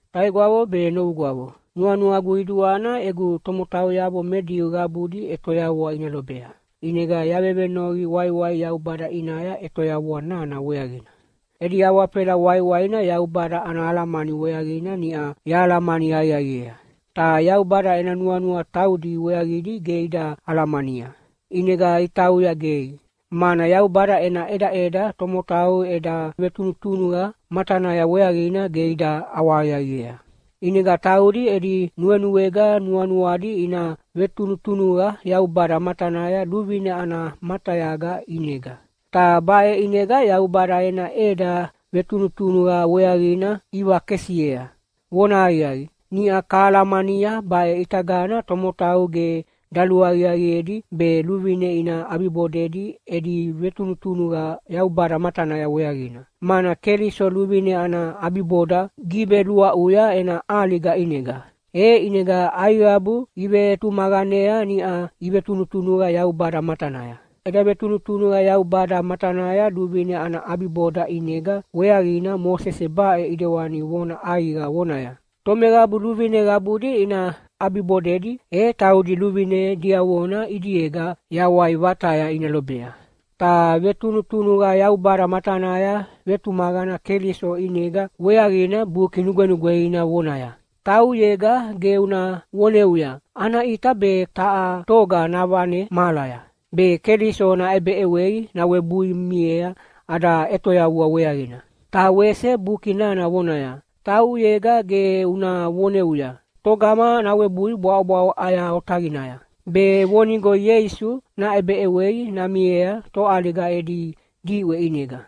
Taigwavo be novugwavo, nuanuagu qiduana egu tomotauyavo me Diu qabudi ʼetoyavua ina lobea, ʼinega yavevenoqi waiwai Yaubada ʼinaya ʼetoyavua nana weaqina. Edi awafela waiwaina Yaubada ana alamani weaqina niʼa yahalamani aqiaqiea. Ta Yaubada ena nuanua taudi weaqidi ge ida alamania, ʼinega itauya gei, mana Yaubada ena ʼedaʼeda tomotau eda vetunutunuqa matanaya weaqina ge ida ʼawahaqiaqiea. ʼInega taudi edi nuenuega nuanuadi ina vetunutunuqa Yaubada matanaya luvine ana matayaga ʼinega. Ta baʼe ʼinega Yaubada ena ʼeda vetunutunuqa weaqina ivakesiea. Vonahaqiaqi, niʼa kahalamania baʼe ʼitagana tomotau ge daluaqiaqiedi be luvine ina ʼabibodedi edi vetunutunuqa Yaubada matanaya weaqina, mana Keliso luvine ana ʼabiboda giveluaʼuya ena ʼaliga ʼinega. E ʼinega aiqabu ivetumaqanea niʼa ivetunutunuqa Yaubada matanaya. Eda vetunutunuqa Yaubada matanaya luvine ana ʼabiboda ʼinega weaqina Mosese baʼe ʼidewani vona ʼaiqa vonaya, “Tomeqabu luvine qabudi ina ʼabibodedi, e taudi luvine diavona ʼidiega yawai vataya ina lobea.” Ta vetunutunuqa Yaubada matanaya vetumaqana Keliso ʼinega weaqina Buki Nugwenugweina vonaya, “Tauʼuyega ge una voneuya, ‘Ana ʼita be taha toga navane mahalaya.’” (Be Keliso naʼebeʼewei nawebui miea ada ʼetoyavua weaqina.) Ta wese Buki nana vonaya, “Tauʼuyega ge una voneuya, ‘Togama nawebui bwaʼobwaʼo ʼaya otaqinaya?’” (Be vonigo Ieisu naʼebeʼewei namiea toʼaliga edi diʼwe ʼinega.)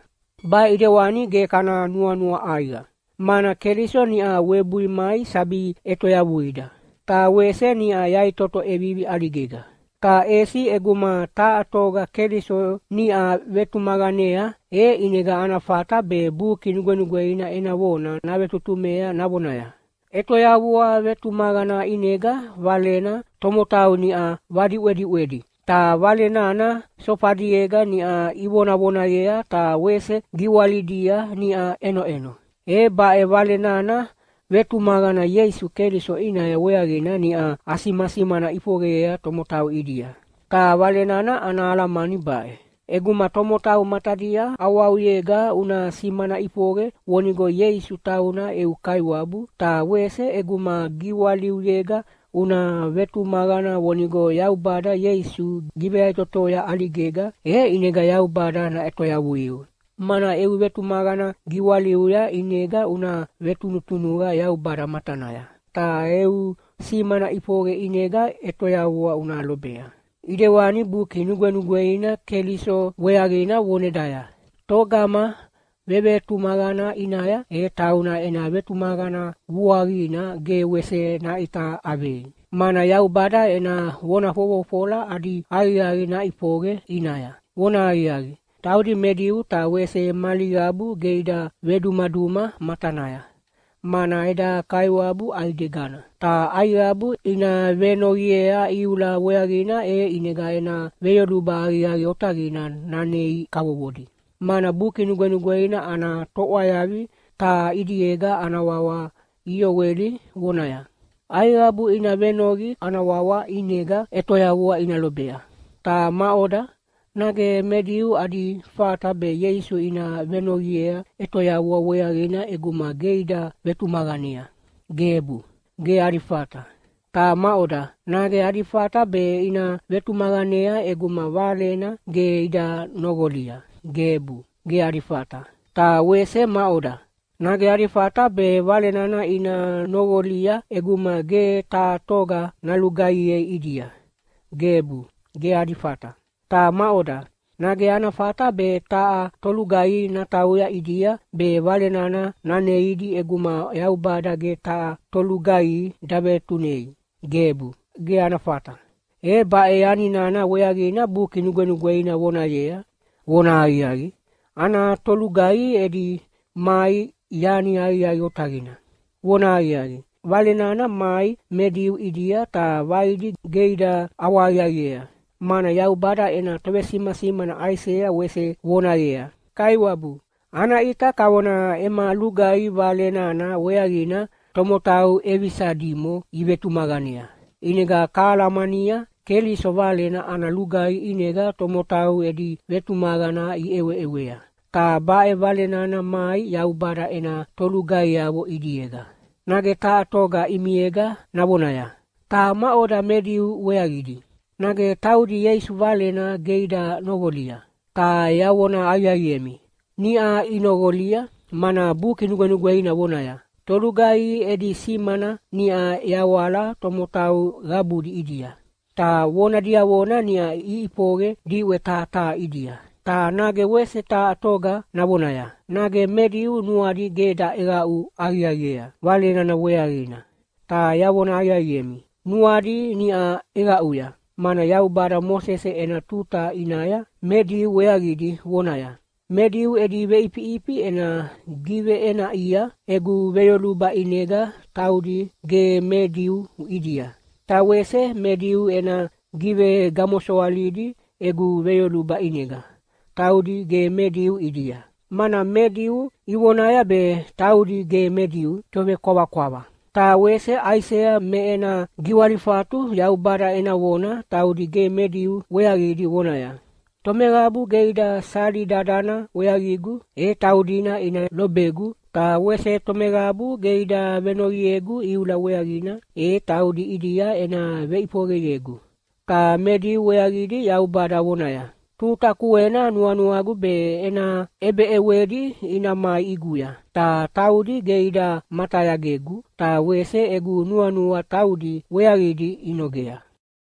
Baʼe ʼidewani ge kana nuanua ʼaiqa, mana Keliso niʼa webui mai sabi ʼetoyavuida, ta wese niʼa yaʼitoto ʼevivi ʼaligega. Ta ʼesi ʼeguma taha toga Keliso niʼa vetumaqanea, e ʼinega ana fata be Buki Nugwenugweina ena vona navetutumea navonaya, “ʼEtoyavua vetumaqana ʼinega Valena tomotau niʼa vadiʼwediʼwedi, ta Vale nana sofadiega niʼa ivonavonayea ta wese giwalidia niʼa ʼenoʼeno.” E baʼe Vale nana vetumaqana Ieisu Keliso ʼinaya weaqina niʼa asimasimana ʼifoqeyea tomotau ʼidia. Ta Vale nana ana alamani baʼe: ʼEguma tomotau matadia ʼawauyega una simana ʼifoqe vonigo Ieisu tauna eu Kaiwabu, ta wese ʼeguma giwaliuyega una vetumaqana vonigo Yaubada Ieisu giveyaʼitotoya ʼaligega, e ʼinega Yaubada naʼetoyavuiu. Mana eu vetumaqana giwaliuya ʼinega una vetunutunuqa Yaubada matanaya, ta eu simana ʼifoqe ʼinega ʼetoyavua una lobea. ʼIdewani Buki Nugwenugweina Keliso weaqina vonedaya, “Togama vevetumaqana ʼinaya, e tauna ena vetumaqana vuaqina ge wese naʼita ʼavei, mana Yaubada ena vona fofofola adi aqiaqi naʼifoqe ʼinaya.” Vonahaqiaqi, taudi me Diu ta wese mali qabu ge ida vedumaduma matanaya, mana eda Kaiwabu ʼaidegana. Ta aiqabu ina venoqiea iula weaqina e ʼinega ena veyoluba aqiaqi otaqina nanei kavovodi, mana Buki Nugwenugweina ana toʼwayavi taha ʼidiega ana wawa Ioeli vonaya, “Aiqabu ina venoqi Kaiwabu ana wawa ʼinega ʼetoyavua ina lobea.” Ta maʼoda, nage me Diu adi fata be Ieisu ina venoqiea ʼetoyavua weaqina ʼeguma ge ida vetumaqanea? Gebu, ge adi fata. Ta maʼoda, nage adi fata be ina vetumaqanea ʼeguma Valena ge ida noqolia? Gebu, ge adi fata. Ta wese maʼoda, nage adi fata be Vale nana ina noqolia ʼeguma ge taha toga nalugaihiea ʼidia? Gebu, ge adi fata. Ta maʼoda, nage ana fata be taha tolugaihi natauya ʼidia be Vale nana naneidi ʼeguma Yaubada ge taha tolugaihi davetunei? Gebu, ge ana fata! E baʼe yani nana weaqina Buki Nugwenugweina vonayea, “Vonahaqiaqi, ana tolugaihi edi mai yani aqiaqi otaqina.” Vonahaqiaqi, Vale nana mai me Diu ʼidia ta vaidi ge ida ʼawahaqiaqiea, mana Yaubada ena tovesimasimana Aisea wese vonayea, “Kaiwabu, ana ʼita kavona ema lugaihi Vale nana weaqina tomotau ʼevisa dimo ivetumaqanea.” ʼInega kahalamania, Keliso Valena ana lugaihi ʼinega tomotau edi vetumaqana iʼeweʼewea, ta baʼe Vale nana mai Yaubada ena tolugaihiavo ʼidiega. Nage taha toga ʼimiega navonaya, “Ta maʼoda me Diu weaqidi, nage taudi Ieisu Valena ge ida noqolia?” Ta yavona aqiaqiemi, niʼa inoqolia mana Buki Nugwenugweina vonaya, “Tolugaihi edi simana niʼa yawala tomotau qabudi ʼidia, ta vona diavona niʼa iʼifoqe diʼwe taha taha ʼidia.” Ta nage wese taha toga navonaya, “Nage me Diu nuadi ge daʼeqaʼu aqiaqiea Vale nana weaqina?” Ta yavona aqiaqiemi, nuadi niʼa ʼeqaʼuya, mana Yaubada Mosese ena tuta ʼinaya me Diu weaqidi vonaya, “Me Diu edi veʼifiʼifi ena giveʼenaʼia egu veyoluba ʼinega taudi ge me Diu ʼidia, ta wese me Diu ena givegamosoalidi egu veyoluba ʼinega taudi ge me Diu ʼidia, mana me Diu ivonaya be taudi ge me Diu tovekwavakwava.” Ta wese Aisea me ena giwalifatu Yaubada ena vona taudi ge me Diu weaqidi vonaya, “Tomeqabu ge ida sali dadana weaqigu, e taudina ina lobegu. Ta wese tomeqabu ge ida venoqiegu iula weaqina, e taudi ʼidia ena veʼifoqeyegu.” Ta me Diu weaqidi Yaubada vonaya, “Tuta kuena nuanuagu be ena ʼebeʼewedi ina mai ʼiguya, ta taudi ge ida matayagegu ta wese egu nuanua taudi weaqidi inogea.”